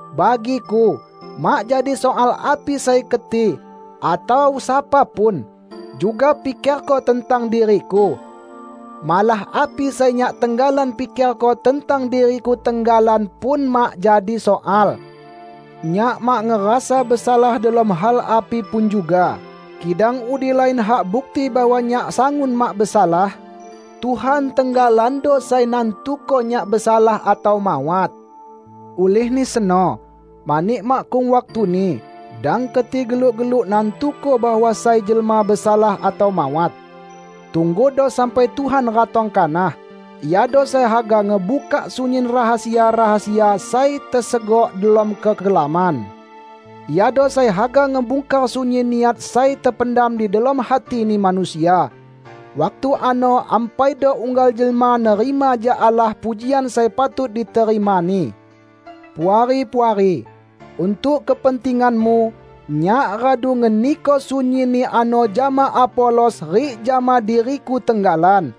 Bagiku, mak jadi soal api sai keti -- atau sapa pun -- juga pikerko tentang diriku. Malah api sai nyak tenggalan pikerko tentang diriku tenggalan pun mak jadi soal. Nyak mak ngerasa besalah delom hal api pun, juga kidang udi lain hak bukti bahwa nyak sangun mak besalah. Tuhan tenggalando sai nantuko nyak besalah atau mawat. Ulihni seno, mani makkung waktuni, dang keti geluk-geluk nantuko bahwa sai jelma besalah atau mawat. Tunggudo sampai Tuhan ratong kanah. Iado sai haga ngebukak sunyin rahasia-rahasia sai tesegok delom kekelaman. Iado sai haga ngebungkar sunyin niat sai tependam di delom hatini manusia. Waktu ano ampaido unggal jelma nerima jak Allah pujian sai patut diterimani. Puari-puari! Untuk kepentinganmu, nyak radu ngeniko sunyinni ano jama Apolos rik jama diriku tenggalan.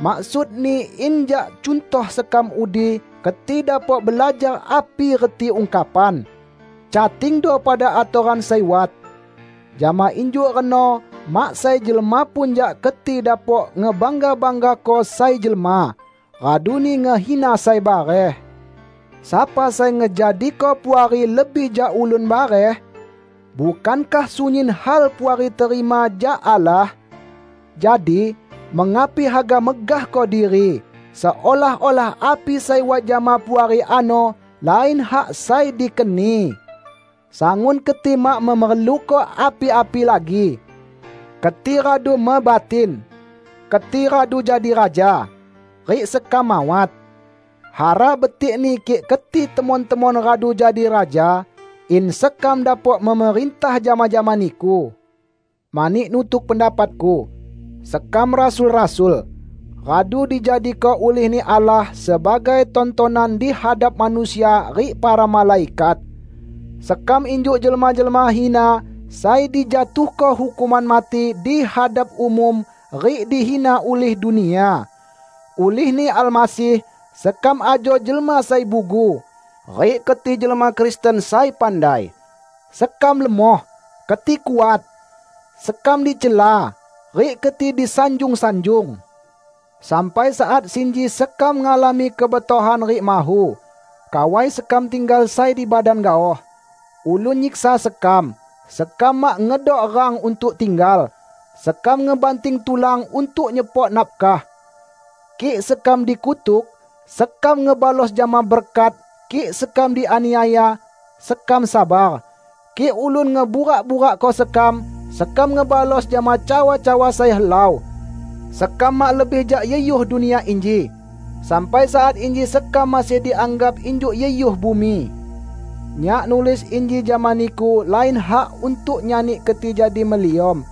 Maksudni in jak cuntoh sekam udi keti dapok belajar api reti ungkapan, "Catingdo pada atoran sai wat." Jama injuk reno mak sai jelma pun jak keti dapok ngebangga-banggako sai jelma, raduni ngehina sai bareh. Sapa sai ngejadiko Puari lebih jak ulun bareh? Bukankah sunyin hal Puari terima jak Allah? Jadi, mengapi haga megahko diri, seolah-olah api sai wat jama Puari ano lain hak sai dikeni? Sangun keti mak memerluko api-api lagi! Keti radu mebatin! Keti radu jadi raja! Rik sekam mawat. Hara betikni kik keti temon-temon radu jadi raja, in sekam dapok memerintah jama-jama niku. Mani nutuk pendapatku, sekam rasul-rasul, radu dijadiko ulih-Ni Allah sebagai tontonan di hadap manusia rik para malaikat. Sekam injuk jelma-jelma hina sai dijatuhko hukuman mati di hadap umum rik dihina ulih dunia. Ulihni Almasih, sekam ajo jelma sai bugu, rik keti jelma Kristen sai pandai! Sekam lemoh, keti kuat! Sekam dicela, rik keti disanjung-sanjung! Sampai saat sinji sekam ngalami kebetohan rik mahu; kawai sekam tinggal sai di badan gaoh; ulun nyiksa sekam; sekam mak ngedok rang untuk tinggal; sekam ngebanting tulan untuk nyepok nafkah. Kik sekam dikutuk, sekam ngebalos jama berkat; kik sekam dianiaya, sekam sabar, kik ulun ngeburak-burakko sekam, sekam ngebalos jama cawa-cawa sai helau. Sekam mak lebih jak yuhyuh dunia inji; sampai saat inji sekam masih dianggap injuk yuhyuh bumi. Nyak nulis inji jama niku lain hak untuk nyani keti jadi meliom,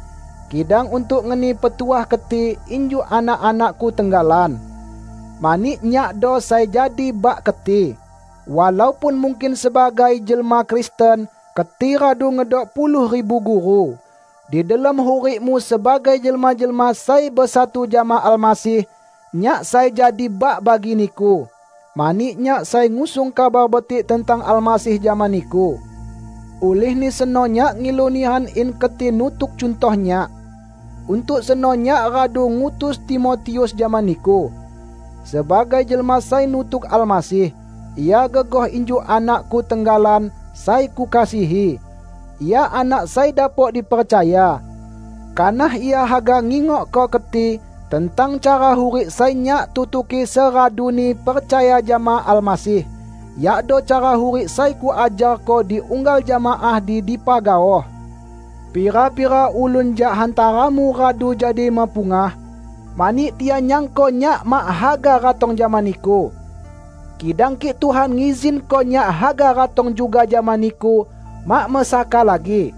kidang untuk ngeni petuah keti injuk anak-anakku tenggalan. Mani nyakdo sai jadi bak keti, walaupun mungkin sebagai jelma Kristen, keti radu ngedok puluh ribu guru. Di delom hurikmu sebagai jelma-jelma sai besatu jama Almasih, nyak sai jadi bak bagi niku, mani nyak sai ngusung Kabar Betik tentang Almasih jama niku. Ulihni seno nyak ngilu nihan in keti nutuk cuntoh nyak. Untuk seno nyak radu ngutus Timotius jama niku. Sebagai jelma sai nutuk Almasih, ia gegoh injuk anakku tenggalan sai kukasihi. Ia anak sai dapok dipercaya. Kanah ia haga ngingokko keti tentang cara hurik sai nyak tutuki seraduni percaya jama Almasih, yakdo cara hurik sai kuajarko di unggal jemaah di dipa gaoh. Pira-pira ulun jak hantaramu radu jadi mepungah, mani tian nyangko nyak mak haga ratong jama niku. Kidang kik Tuhan ngizinko nyak haga ratong juga jama niku mak mesaka lagi.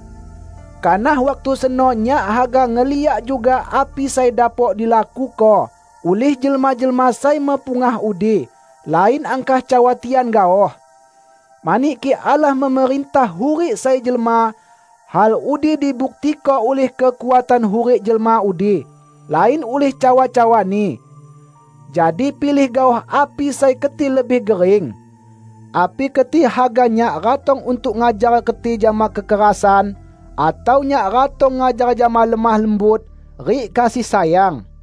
Kanah waktu seno nyak haga ngeliak juga api sai dapok dilakuko ulih jelma-jelma sai mepungah udi; lain angkah cawa tian gaoh. Mani kik Allah memerintah hurik sai jelma, hal udi dibuktiko ulih kekuatan hurik jelma udi, lain ulih cawa-cawani. Jadi pilih gaoh api sai keti lebih gering! Api keti haga nyak ratong untuk ngajar keti jama kekerasan atau nyak ratong ngajar jama lemoh lembut rik kasih sayang?